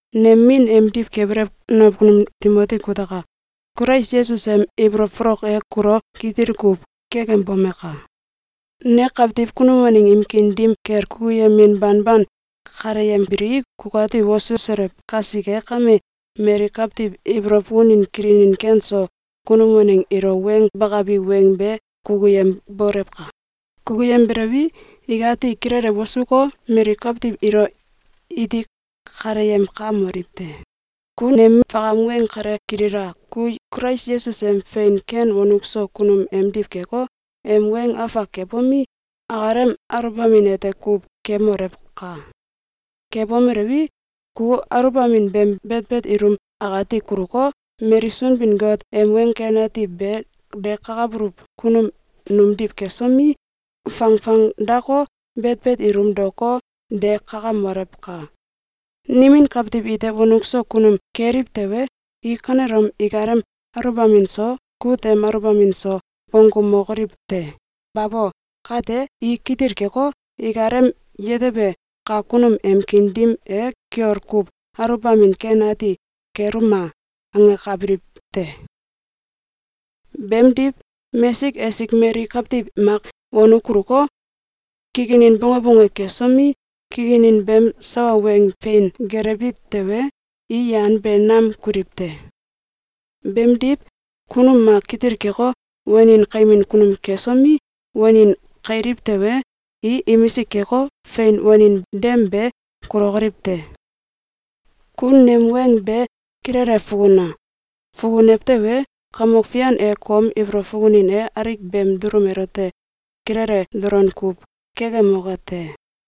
Nem min emdiw kebelew nakunum Timoti kutaka! Kulais Yesus em ibolow folok e kulo kitil kuw kekembomaka! Ne kawtiw kunum waneng im kiin dim kel kukuyemin banban kaleyembilii, kukati wosuselew kasike kame, mali kawtiw ibolow fukunin kilinin ken so kunum waneng ilo weng bakabi weng be kukuyembolewka! Kukuyembelewi, ikati kilele wosuko, mali kawtiw ilo iti kaleyemkamoliw te! Ku nem fakam weng kale kilila! Ku Kulais Yesus em fein ken wonuk so kunum emdiw keko, em weng afak kebomi, akalem aluwbamin ete kuw kemolewka! Kebomelewi, ku aluwbamin beem betbet ilum akati kuluko, mali Sunbin-Got em Weng Ken Ati be dekakabuluw kunum numdiw kesomi, fangfang dako, betbet ilum daoko, de kakamolewka! Nimin kawtiw ite wonuk so kunum keliw tewe, i kanelom ikalem aluwbamin so, kut em aluwbamin so, bonggumokoliw te! Babo! Kate, i kitil keko, ikalem yetebe kak kunum em kiin dim e “Kiol kuw aluwbamin ken ati keluma!”, angakabiliw te. Beemdiw, mesik esik mali kawtiw mak wonuk kuluko, kikinin bonge bonge kesomi, kikinin beem sawa weng fein gelewiw tewe, i yan be nam kuliw te. Beemdiw, kunum mak kitil keko, wanin kaimin kunum kesomi, wanin kailiw tewe, i imisik keko, fein wanin dem be kulokoliw te. Ku nem weng be kilele fukuna! Fukunew tewe, Kamok Fian e kom ibolow fukunin e alik beem dulum elote kilele dolon kuw kekemoke te.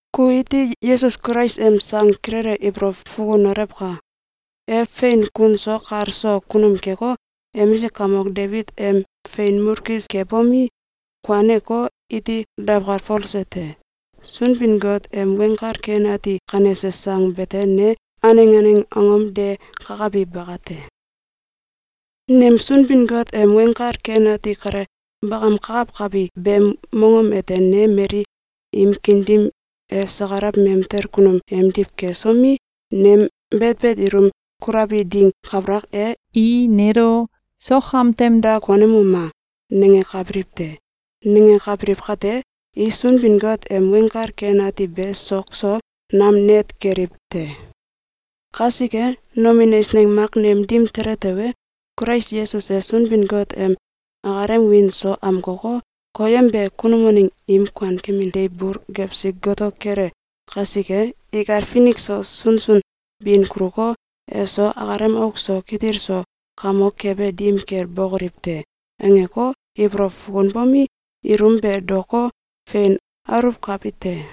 Ku iti Yesus Kulais em sang kilele ibolow fukunolewka! E fein kun so kal so kunum keko, emisik kamok Debit em fein mulkis kebomi, kuaneko, iti dawkalfolse te. Sunbin-Got em Weng Kal Ken Ati kanese sang bete ne aneng aneng angom de kakabi bakate. Nem Sunbin-Got em Weng Kal Ken Ati kale bakamkakawkabi beem mongom ete ne mali im kiin dim e sakalaw mamtel kunum emdiw kesomi, nem betbet ilum kulabi ding kabalak e, i nelo “Sok am tem da konemuma!”, nangakabiliw te. Nangakabiliw kate, i Sunbin-Got em Weng Kal Ken Ati be sok so nam net keliw te. Kasike, nomin eisneng mak nem dim tele tewe, “Kulais Yesus e Sunbin-Got em akalem wiin so amkoko, koyembe kunum waneng im kuankemin deiw bul gewsi goto kele kasike, ikal finik so sunsun bin kuluko, eso akalem auk so kitil so kamok kebe dim kel bokoliw te!”, angeko, ibolow fukunbomi, ilum be daoko, fein aluwkabi te.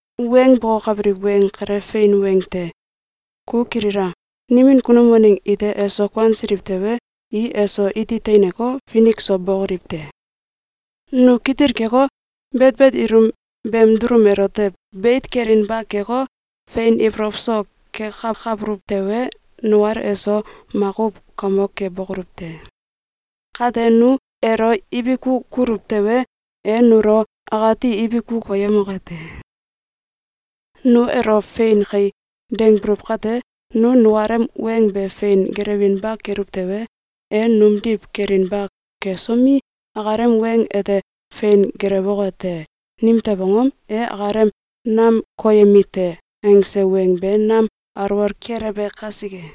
Weng bokokabiliw weng kale fein weng te! Ku kilila! Nimin kunum waneng ite eso kuansiliw tewe, i eso iti teineko, finik so bokoliw te. Nu kitil keko, betbet ilum beem dulum elote beit kelinba keko, fein ibolow so kekakabuluw tewe, nukal eso makuw kamok kebokoluw te. Kate nu elo ibiku kuluw tewe, e nulo akati ibiku koyemoke te. Nu elo “Fein kai!”, dangbuluw kate, nu nukalem weng be fein gelewinba keluw tewe, e numdiw kelinba kesomi, akalem weng ete fein gelewoke te! Nimtew angom? E akalem “Nam koyemi te!”, angse weng be nam alwol kelewbe kasike.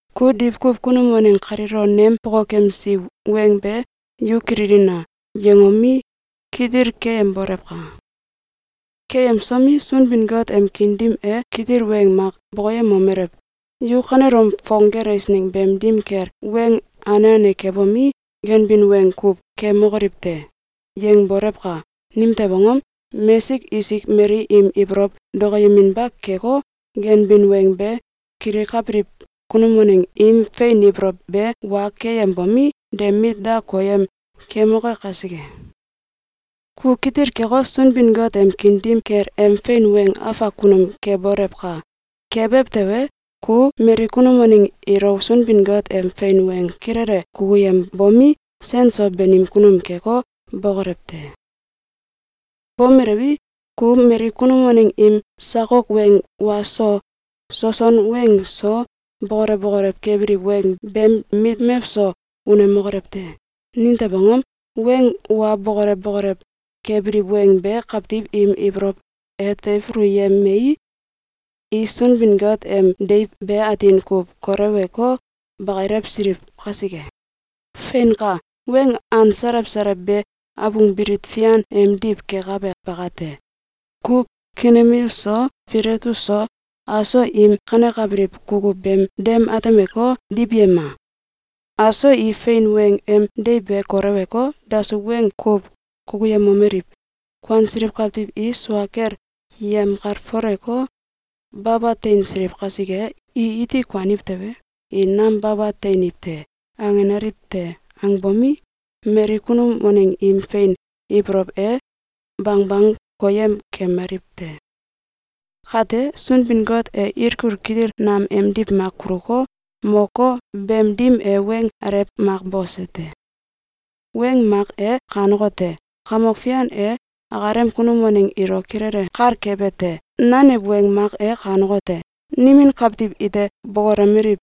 Ku diwkuw kunum waneng kaliilo nem bokokemsi weng be “Yu kililina!”, yangomi, kitil keyembolewka! Keyemsomi, Sunbin-Got em kiin dim e kitil weng mak bokoyemomelew: “Yu kanelom fong eisneng beem dim kel weng ane ane kebomi, ganbin weng kuw kemokoliw te!”, yangboléwka! Nimtew angom? Mesik esik mali im ibolow dokoyeminba keko, ganbin weng be, kilikabiliw kunum waneng im fein ibolow be wa keyembomi, de mit da koyem kemoke kasike. Ku kitil keko, Sunbin-Got em kiin dim kel em fein weng afak kunum kebolewka! Kebew tewe, ku mali kunum waneng ilo Sunbin-Got em fein weng kilele kukuyembomi, sen so banim kunum keko, bokolew te. Bomelewi, ku mali kunum waneng im sakok weng wa so, soson weng so, bokolew bokolew kebiliw weng beem mit mewso unemokolew te! Nimtew angom? Weng wa bokolew bokolew kebiliw weng be kawtiw im ibolow e teifuluyemei, i Sunbin-Got em deiw be atin kuw kolewko, bakilewsiliw kasike. Feinka! Weng an salew salew be abung fian bilit emdiw kekabe bakate. Ku Kimeneus so, Filetus so, aso im kanekabiliw kukuw beem dem atemeko, diwyema! Aso i fein weng em deiw be koleweko, dasuw weng kuw kukuyemomeliw: “Kuansiliw kawtiw i sua kel yemkalfoleko, baba teinsiliw kasike, i iti kuaniw tewe, i nam baba teiniw te.”, angenaliw te. Angbomi, mali kunum waneng im fein ibolow e, bangbang koyem kemaliw te. Kate, Sunbin-Got e ilkul kitil nam emdiw mak kuluko, moko, beem dim e weng alew mak bose te. Weng mak e kanekote: “Kamok Fian e akalem kunum waneng ilo kilele kal kebe te!” Nanew weng mak e kanekote: “Nimin kawtiw ite bokolomeliw: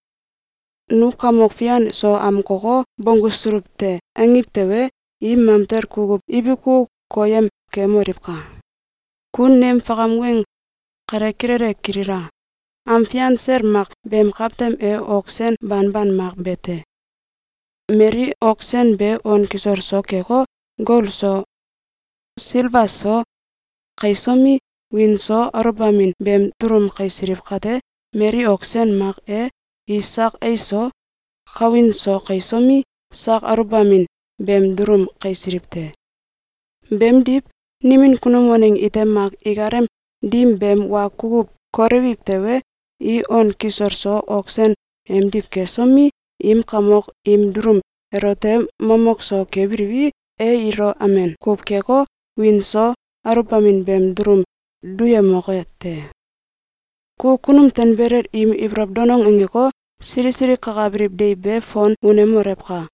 ‘Nu Kamok Fian so amkoko, bonggusuluw te!’, angiw tewe, i mamtel kukuw ibiku koyem kemoliwka!” Ku nem fakam weng kale kilele kilila! Am fian sel mak beem kawtem e ok sen banban mak bete. Mali ok sen be on kisol so keko, gol so, silba so, kaisomi, wiin so aluwbamin beem dulum kaisiliw kate, mali ok sen mak e i sak ais so, kawin so kaisomi, sak aluwbamin beem dulum kaisiliw te. Beemdiw, nimin kunum waneng ite mak ikalem dim beem wa kukuw kolewiw tewe, i on kisol so ok sen emdiw kesomi, im kamok im dulum elote momow so kebiliwi, e ilo amen kuw keko, wiin so aluwbamin beem dulum duyemoke te. Ku kunum tanbelel im ibolow danong angeko, sili sili kakabiliw deiw be fon unemolewka!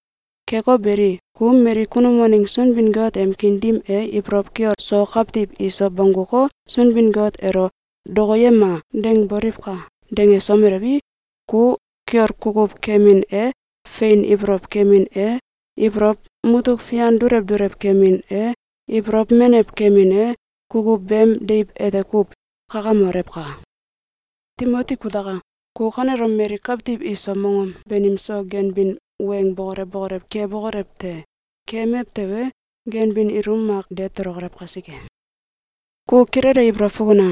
Keko beli, ku mali kunum waneng Sunbin-Got em kiin dim e ibolow kiol so kawtiw iso bongguko, Sunbin-Got elo “Dokoyema!”, dangboliwka! Dangesomeliwi, ku kiol kukuw kemin e, fein ibolow kemin e, ibolow mutuk fian dulew dulew kemin e, ibolow menew kemin e, kukuw beem deiw ete kuw kakamolewka! Timoti kutaka! Ku kanelom mali kawtiw iso mongom banim so ganbin weng bokolew bokolew kebokolew te! Kemew tewe, ganbin ilum mak de tolokolew kasike. Ku kilele ibolow fukuna!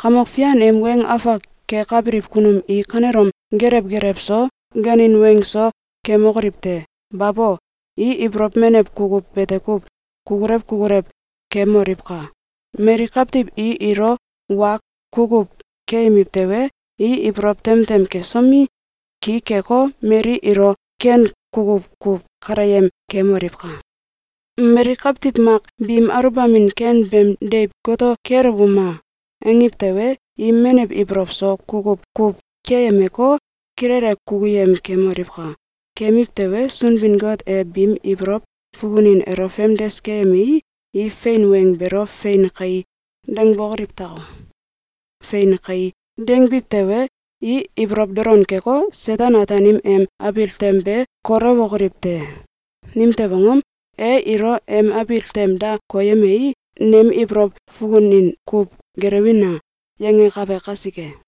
Kamok Fian em weng afak kekabiliw kunum i kanelom geelew geelew so, ganin weng so, kemokoliw te! Babo! I ibolow menew kukuw bete kuw kukulew kukulew kemoliwka! Mali kawtiw i ilo wa kukuw keyemiw tewe, i ibolow tem tem kesomi, ki keko, mali ilo ken kukuw kuw kaleyem kemoliwka! Mali kawtiw mak biim aluwbamin ken beem deiw “Goto kelewuma o!”, angiw tewe, i menew ibolow so kukuw kuw keyemeko, kilele kukuyem kemoliwka! Kemiw tewe, Sunbin-Got e biim ibolow fukunin elo famdes keyemei, i fein weng beelo “Fein kai!”, dangbokoliw tako. “Fein kai!”, dangbiw tewe, i ibolow dolon keko, Seten-Ataanim em abil tem be kolewokoliw te. Nimtew angom? E ilo em abil tem da koyemei, “Nem ibolow fukunin kuw gelewina!”, yangakabe kasike.